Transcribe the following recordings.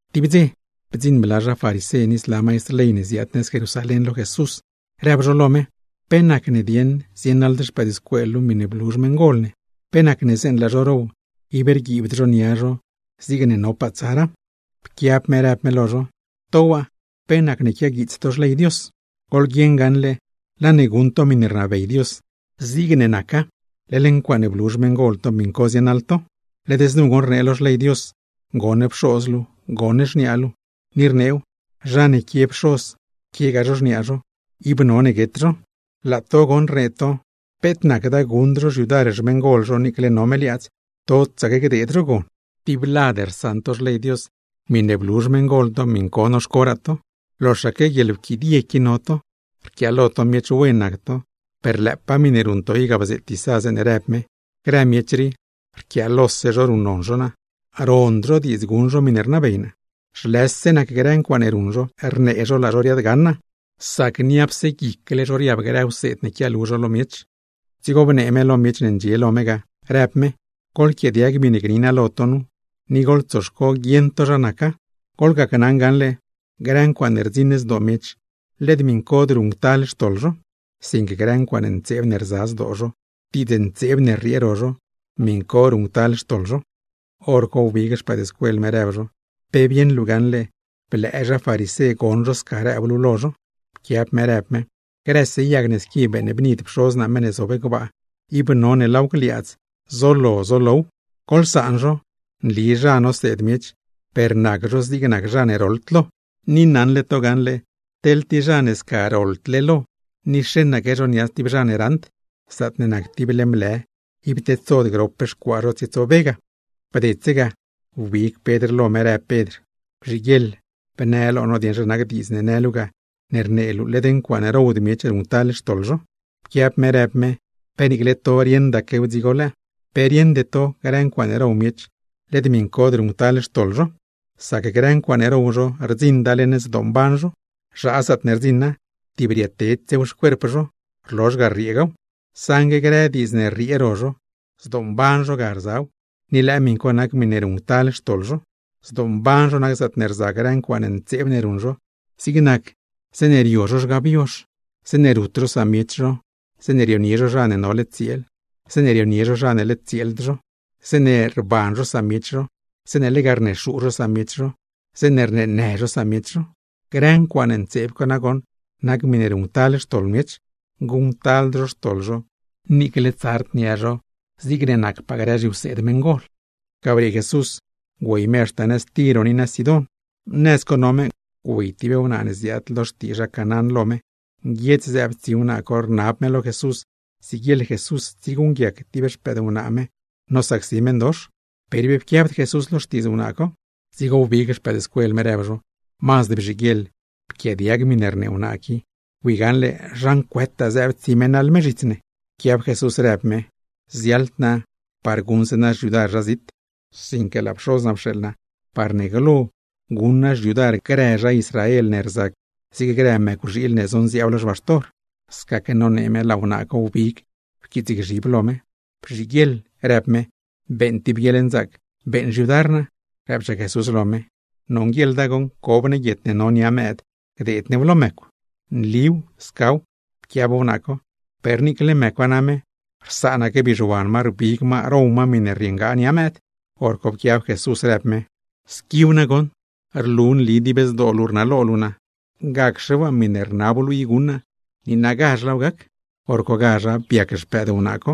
Tib dze, bdziṉ bla zha farisé ni zla maistr ley ne ziaad nëz Jerusalén, lo Jesús; rëb zho lo me: ―¿Pe nacne dieṉ zienaḻd xpëëdscuel luu miṉe blu xmeṉgol ne, pe nacne zeeṉe laa zho row, ib rguiibd zho nia zho zigne nopaa tsara? Pquiab me rëb me lo zho: ―¿To waa, pe nacne quiaguiits to xley Dios? Goḻguieṉ gaṉle laa ne guṉ to miṉe rnabey Dios zigne naca, leḻ ncuaaṉe blu xmeṉgol to, miṉ co zienaḻ to. Led znu goṉ rnee lo xley Dios: “Goṉ pxoz luu, goṉ xniaa luu”, ni rneew: “Zha ne quie pxoz, quiegaa zho xniaa zho, ib none guet zho.” Laa to goṉ rnee to: “Peet nacda guṉd zho xyudar xmeṉgol zho niicle no me liaadz, totsaque gdeed zho gon.” Tib lad rsaṉ to xley Dios, miṉe blu xmeṉgol to miṉ co noxcoraa to. ¡Loxaque guieḻwquidie qui no to! Rquiaalo to miech wen nac to, per lëëpaa miṉe ruṉ to i ga bzeet Isá zeeṉe rëb me: Grë miech rii, rquiaalose zho ruṉnon zho naa, rond zho diidz guṉ zho miṉe rnabey naa. Zhlëse nac grë ncuaaṉe ruṉ zho, rnee zho laa zho riaadgaṉ naa; sac niapse guicle zho riab grë wseed ne quialu zho lo miech. Dzigo bnee me lo grë miech ne ndxie lo me ga, rëb me: ―Goḻquiaadiag miṉe gni naa lo to nu, ni goḻtsoxco guieṉ to zha naca. Goḻgacnaṉ gaṉle, grë ncuaaṉe rdziṉ zdoo miech, led miṉcod ruṉctal xtoḻ zho; sinque grë ncuaaṉ ntseeb ne rza guic zho, diidz ntseeb ne rriee ro zho, miṉ co ruṉctal xtoḻ zho. Horco wbig xpëëdscuel me, rëb zho: ―¿Pe bieṉ luu gaṉle blëë zha farisé goṉ zho sca rëb luu lo zho? Pquiab me rëb me: ―Grëse yag ne squi beeṉbnid Pxoz naa meṉ ne zob gbaa, ib none laaw gliaadz zolo zolow. Goḻsaan zho, nli zha noseed miech per nac zho zig nac zha ne roḻd lo. Ni naṉle to gaṉle, teḻ tib zha ne sca roḻdle lo ni xeṉaque zho nia stib zha ne raṉd, zaatne nac tib leṉ blë, ib tedsod grop xcuaa zho tsietsobe ga. Bdedse ga, wbig Pedr lo me rëb Pedr: ―Bzhiguieḻ bnë lo no dieṉ zha nac diidz ne në luu ga, ne rnee luu led ncuaaṉe rowd miech ruṉctal xtoḻ zho. Pquiab me rëb me: ―¿Pe niicle to rieṉdaquew dzigo lëë? ¿Pe rieṉde to grë ncuaaṉe row miech, led miṉcod ruṉctal xtoḻ zho? Sac grë ncuaaṉe row zho rdziṉda leṉ zdoomban zho, zhaa zaatne rdziṉa; tib rietedsew xcuerp zho, rlozh ga rrieegaw. Saṉgue grë diidznë ne rriee ro zho, zdoomban zho ga rzaw, ni lëë miṉ co nac miṉe ruṉctal xtoḻ zho. Zdoomban zho nac zaatne rza grë ncuaaṉ ntseeb ne ruṉ zho, zig nac: zeeṉe rio zho grë zhgab yozh, zeeṉe rut zho samiech zho, zeeṉe rionie zho zha ne nole tsieel, zeeṉe rionie zho zha ne nacd tsieel zho, zeeṉe ruṉ zho guieḻgbaan, zeeṉe lega rnexuu zho samiech zho, zeeṉe rneenë zho samiech zho. Grë ncuaaṉ ntseeb co nagoṉ nac miṉe ruṉctal xtoḻ miech, guṉctald zho xtoḻ zho niicle tsard nia zho zigne nacpaa grë zhiwseed meṉgol. Ga briee Jesús, güey me haxta nëz Tiro ni nëz Sidón. Nëz co no me güey tib wnaa ne ziaad lo xtii zha Canaán lo me, nguiedz zëëb tsi wnaa co rnab me lo Jesús siguieḻ Jesús tsieguṉguiac tib xpëdwnaa me nosacsi meṉdox. Per ib pquiabd Jesús lo xtiidz wnaa co, dzigo wbig xpëëdscuel me, rëb zho: ―Mazd bzhiguieḻ pquiaadiag miṉe rnee wnaa qui, bui gaṉle zha ncuëtaa zëëb tsi me naḻ me zhits ne. Pquiab Jesús rëb me: ―Ziaḻd naa par guṉ naa xyudar zha zit, sinque laa Pxoz naa pxeeḻ naa par guṉ naa xyudar grë zha Israel ne rzac zig grë mëcwxiil ne zonziaab lo xbaxtor. Scaque nonee me laa wnaa co wbig pquiitsgzhib lo me. ―Bzhiguieḻ ―rëb me―, beeṉ tib guieḻnzaac beeṉ xyudar naa. Rëbchaa Jesús lo me: ―Nonguieḻda goṉ, cob ne guiet ne no nia mëëd gdeed new lo mëcw. ―Nliw, scaw ―pquiab wnaa co―, per niicle mëcwa name rsaanaque bizhuan ma rbig ma row ma miṉe rrieengaa nia mëëd. Horco pquiab Jesús rëb me: ―¡Squiw nagoṉ! ¡Rlu nli dib zdoo luu rnalo luu naa! Gacxe waa miṉe rnab luu i guṉ naa, niinagazh laaw gac. Horcogazh biac xpëëd wnaa co.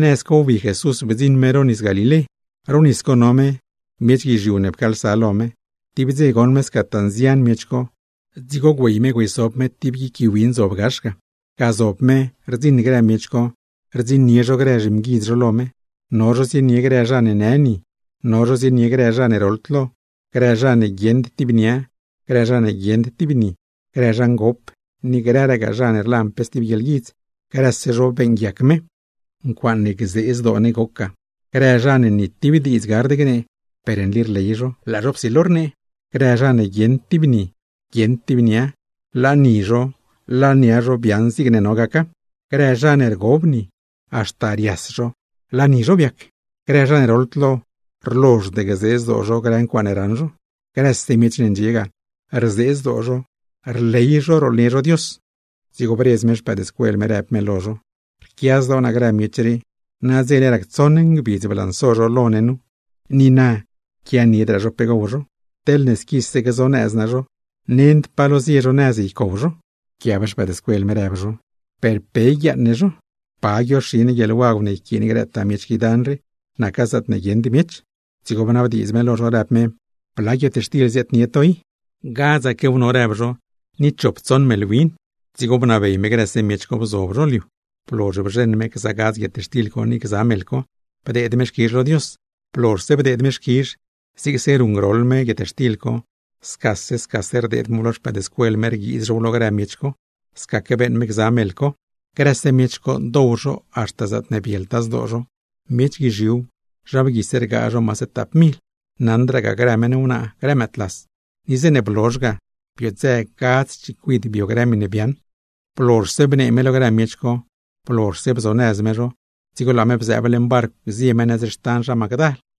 Nëz co wbi Jesús bdziṉ me ro Nisdoo Galilé. Ro nis co no me, miech guizhiu ne pcaalsa lo me. Tib dze goṉ me scataa nzian miech co, dzigo güey me güeysob me tib guic gui win zob gax ga. Ga zob me rdziṉ grë miech co rdziṉnie zho grë zhimguidz zho lo me, no zho zienie grë zha ne në ni, no zho zienie grë zha ne roḻd lo, grë zha ne guieṉd tib nia, grë zha ne guieṉd tib ni, grë zha ngop, ni grëragaa zha ne rlan pe stib guieḻguidz; grëse zho beeṉguiac me. ¡Ncuaaṉe gzee zdoo ne goc ga! Grë zha ne ni tib diidz gard gnee, per nli rley zho laa zho psilo rnee; grë zha ne guieṉd tib ni, guieṉd tib nia, laa ni zho laa nia zho biaaṉ zigne no gaca; grë zha ne rgob ni, haxta rias zho laa ni zho goc-wen; grë zha ne roḻd lo, rlozhd gzee zdoo zho grë ncuaaṉe raṉ zho. Grëse miech ne ndxie ga, rzee zdoo zho, rley zho rooḻnie zho Dios. Dzigo bredz me xpëëdscuel me rëb me lo zho: ―Rquia zdoo naa grë miech rii. Nadzele rac tsoṉ ngbidz blanso zho lo ne nu, ni na quianiedraa zho pe gow zho. Teḻne squise gzonëz naa zho, nend pa lo zie zho nëz ycow zho. Pquiab zho rëb zho: ―¿Per pe yguiaaṉ ne zho? ¿Pa guioxi ne guieḻwagw ne yquiin grëtaa miech qui dan rii, naca zaatne guieṉd miech? Dzigo bnabdiidz me lo zho, rëb me: ―¿Bla guietxtil ziaadnie to i? ―Gadzaquew no ―rëb zho―, ni chop tsoṉ meḻ win. Dzigo bnabey me grëse miech co bzob zho lo liu. Blozh bzheṉ me gza gadz guietxtil co, ni gza meḻ co, bdeed me xquizh lo Dios; blozhse bdeed me xquizh, zigse ruṉgroḻ me guietxtil co scase scase rdeed mew lo xpëëdscuel me rguiiz zhow lo grë miech co; scaque beeṉ me gza meḻ co. Grëse miech co dow zho haxta zaatne bieltaa zdoo zho. Miech guizhiuw, zha bguise rgaa zho maase tap mil, naṉdragaa grë meṉ wnaa, grë mëëdlas; ni zeeṉe blozh ga bii biodzë gadz chicuid bio grë miṉe biaaṉ. Blozhse bnee me lo grë miech co, blozhse bzonëz me zho, dzigo laa me bzëëb leṉ barcw zie ne nëz xtan zha Magdal.